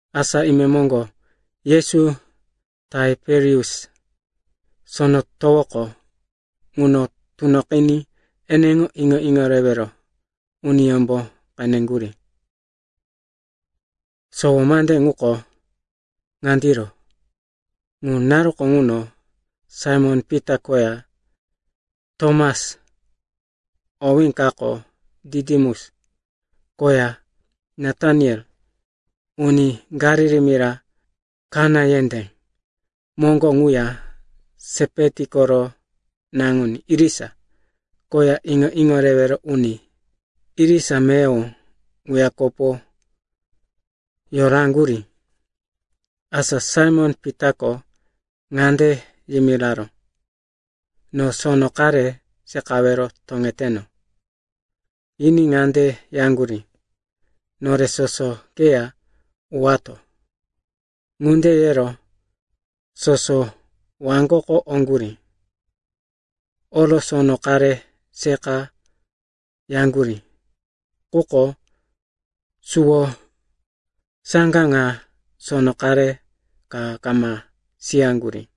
Asa imemoŋgo Yesu Taiperius Sono Towoko ŋuno tunoqiní eneŋo iŋo-iŋo rewero uniyómbo qeneŋgurí. Sowo mande ŋuko ŋandiro. Ŋu naruko ŋuno Saimon-Pita koya Tomas (owí kako Ditimus) koya Nataniel, uni Galili mira Kana yendé moŋgo quya Sepeti koro naŋuní irisa koya iŋo-iŋo rewero uni irisa meyowo ŋuya kopo yoraŋgurí. Asa Saimon-Pitako ŋande yimiraró, “No sono qare seqawero toŋeteno.” Yiní ŋande yaŋgurí, “Nore soso keya uwato.” Ŋunde yero soso waŋgoko oŋgurí. Oro sono qare seqa yaŋgurí, quko suwo saŋga ŋa sono qare ka kama siyaŋgurí.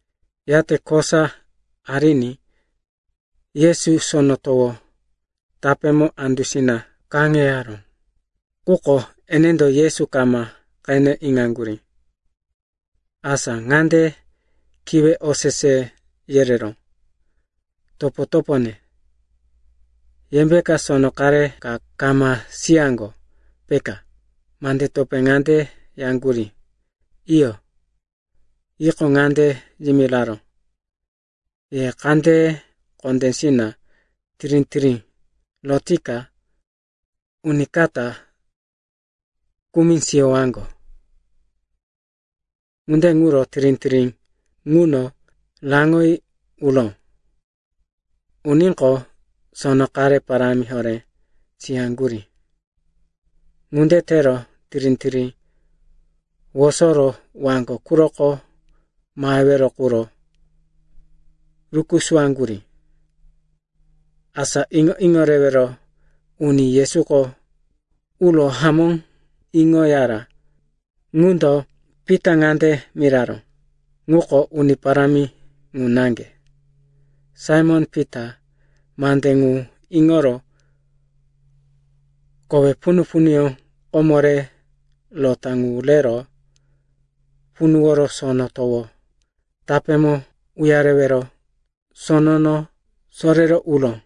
Yate kosa ariní Yesu sono towo tapémo andusina kaŋeyaró, quko enendo Yesu kama qene iŋaŋgurí. Asa ŋande kiwe osese yereró, “Topo-topone, yembe sono qare ka kama siyaŋgo, peka?” Mande topé ŋande yaŋgurí, “Iyo.” Yiqo, ŋande yimiraró, “Ye kandeye kondésina tirí-tirí rotika uníkata kumi siyowaŋgo.” Ŋunde ŋuro tirí-tirí ŋuno raŋoyi uró. Uníqo, sono qare parámi horé siyaŋgurí. Ŋunde tero tirí-tirí wosoro waŋgo quroko mahewero quro rukusuwaŋgurí. Asa iŋo-iŋo rewero uni Yesuko ŋuro hamó iŋoyara ŋundo Pita ŋande miraró, “Ŋuko Uni Parámi ŋu naŋge.” Saimon-Pita mande ŋu iŋoro kowe punu-punuyó komo re rota ŋu rero punuworo sono towo tapémo uyarewero sonono sorero uró.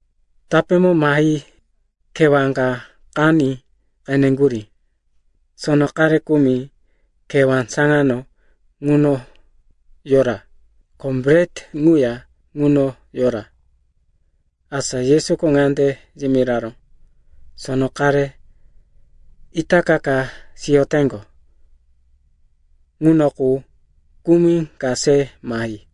Tapémo mahi kewá ka qaní qeneŋgurí. Sono qare kumi kewá saŋano ŋuno yora, ko bret ŋuya ŋuno yora. Asa Yesuko ŋande yimiraró, “Sono qare itaka siyoteŋgo ŋuno qu kumi ka se mahi.”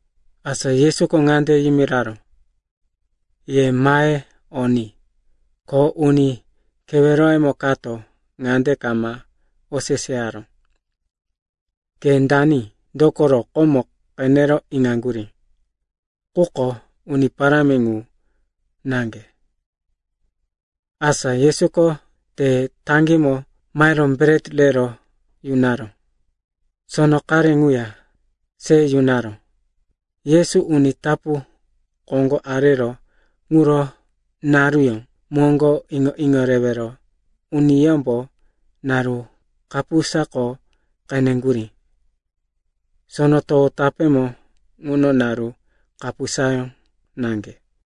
Asa Yesuko ŋande yimiraró, “Ye mahe o ni.” Ko uni keweroyemo kato ŋande kama oseseyaró, “Ke dani?” Dokoro komo qene iŋaŋgurí, ŋuko Uni Parámi ŋu naŋge. Asa Yesuko te taŋgímo mahero bret rero yunaró. Sono qare ŋuya se yunaró. Yesu uni tapu koŋgo areró quro naruyó moŋgo iŋo-iŋo rewero uniyómbo naru kapusako qeneŋgurí. Sono towo tapémo ŋuno naru kapusayó naŋge.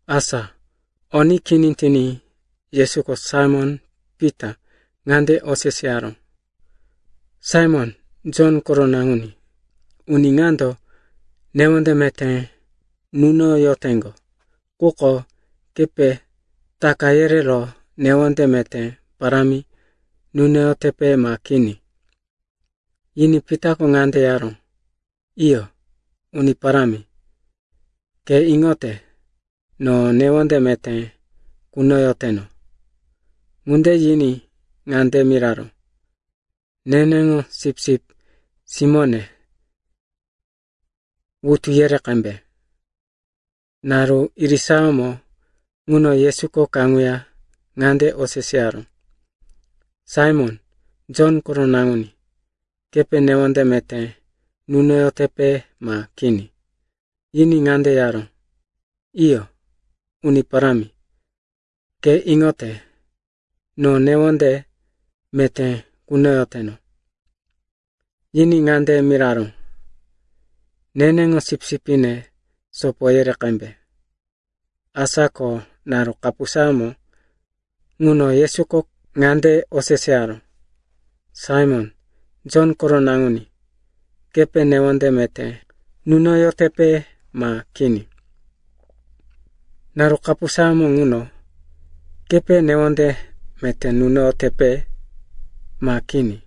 Asa o ni kini tiní, Yesuko Saimon-Pita ŋande oseseyaró, “Saimon, Jon koro naŋuní, uni ŋando newonde meté nunoyoteŋgo, quko kepe taka yerero newonde meté parámi nunoyotepe ma kini?” Yiní Pitako ŋande yaró, “Iyo, Uni Parámi, ke iŋote, no newonde meté kunoyoteno.” Ŋunde yiní ŋande miraró, “Neneŋo sipsip simóne wutu yere qembe.” Naru irisayómo ŋuno Yesuko kaŋuya ŋande oseseyaró, “Saimon, Jon koro naŋuní, kepe newonde meté nunoyotepe ma kini?” Yiní ŋande yaró, “Iyo, Uni Parámi, ke iŋote, no newonde meté kunoyoteno.” Yiní ŋande miraró, “Neneŋo sipsipne sopo yere qembe.” Asa ko naru kapusayómo ŋuno Yesuko ŋande oseseyaró, “Saimon, Jon koro naŋuní, kepe newonde meté nunoyotepe ma kini?” Naru kapusayómo ŋuno, “Kepe newonde meté nunoyotepe ma kini?”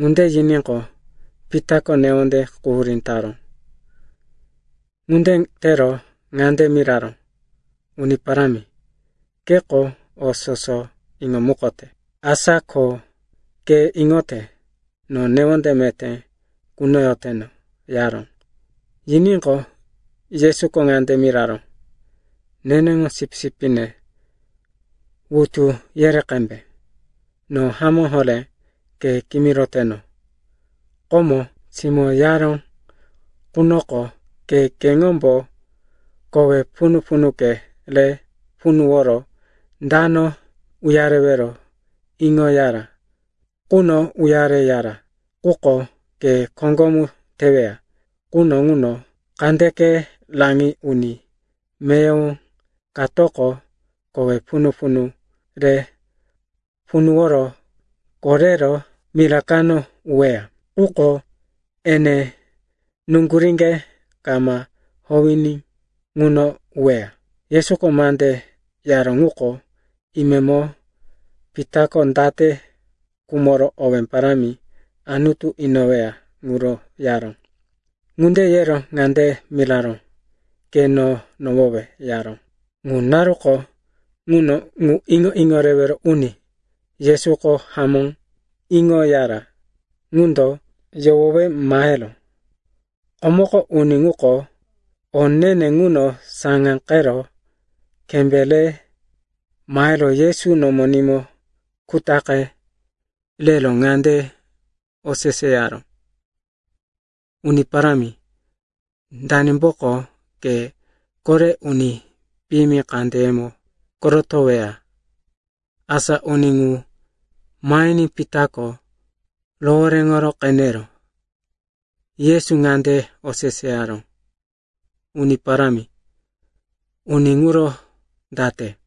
ŋunde yiníqo, Pitako newonde quhurí taró. Ŋunde tero ŋande miraró, “Uni Parámi, keko o soso iŋomukote. Asa ko ke iŋote, no newonde meté kunoyoteno,” yaró. Yiníqo, Yesuko ŋande miraró, “Neneŋo sipsipne wutu yere qembe. No hamó horé ke kimiroteno, komo, simó yaró ŋunoko, ke keŋombo kowe punu-punuke re punuworo dano uyarewero iŋoyara ŋuno uyareyara. Quko ke koŋgomu teweya quno ŋuno kandeke raŋi uni meyowo katoko kowe punu-punu re punuworo korero mira kano uweya. Quko ene nuŋguríŋge kama howiní ŋuno uweya.” Yesuko mande yaró ŋuko imemo Pitako date khumoro owé parámi Anutu inoweya ŋuro yaró. Ŋunde yero ŋande miraró, “Ke no nohowe,” yaró. Ŋu naruko ŋuno ŋu iŋo-iŋo rewero uni Yesuko hamó iŋoyara ŋundo yohowe maheró. (Komoko uni ŋuko o ne-ne ŋuno saŋáqero kembé re mahero Yesu nomonímo kutaqe rero ŋande oseseyaró, “Uni Parámi, danimboko ke kore uni piyimi kandeyemo korotoweya?”) Asa uni ŋu mahiní Pitako rohoréŋo qenero Yesu ŋande oseseyaró, “Uni Parámi, uni ŋuro date?”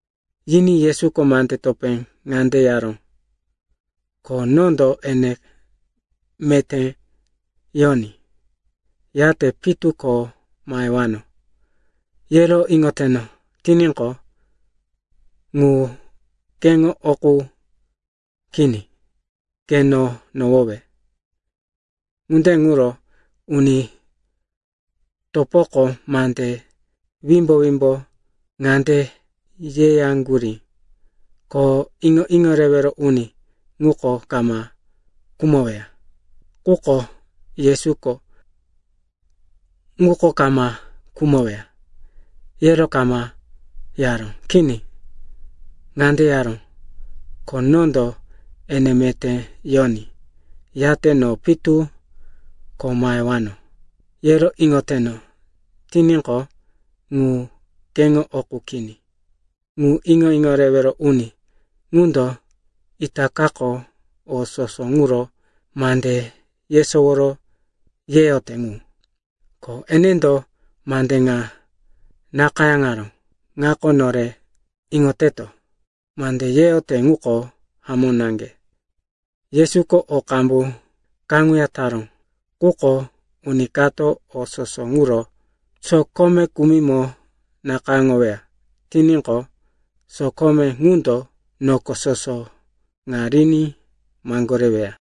Yiní Yesuko mande topé ŋande yaró, “Ko nondo ene meté yoní, yate pitu ko mahewano, yero iŋoteno tiníqo, ŋu keŋo o qu kini. Ke no nohowe.” Ŋunde ŋuro uni topoko mande wimbo-wimbo ŋande yeyaŋgurí, ko iŋo-iŋo rewero uni ŋuko kama khumoweya. Quko Yesuko, ŋuko kama khumoweya, yero kama yaró. Kini. Ŋande yaró, “Ko nondo ene meté yoní, yate no pitu ko mahewano, yero iŋoteno tiníqo, ŋu keŋo o qu kini.” Ŋu iŋo-iŋo rewero uni ŋundo itakako o soso ŋuro mande yesowo yeyote ŋu, ko enendo mande ŋa nakayáŋaró. Ŋako nore iŋoteto, mande yeyote ŋuko hamó naŋge. Yesuko o qambu kaŋuya taró. Quko uni kato o soso ŋuro sokome kumimo nakayáŋoweya tiníqo, sokome ŋundo noko soso ŋa riní maŋgoreweya.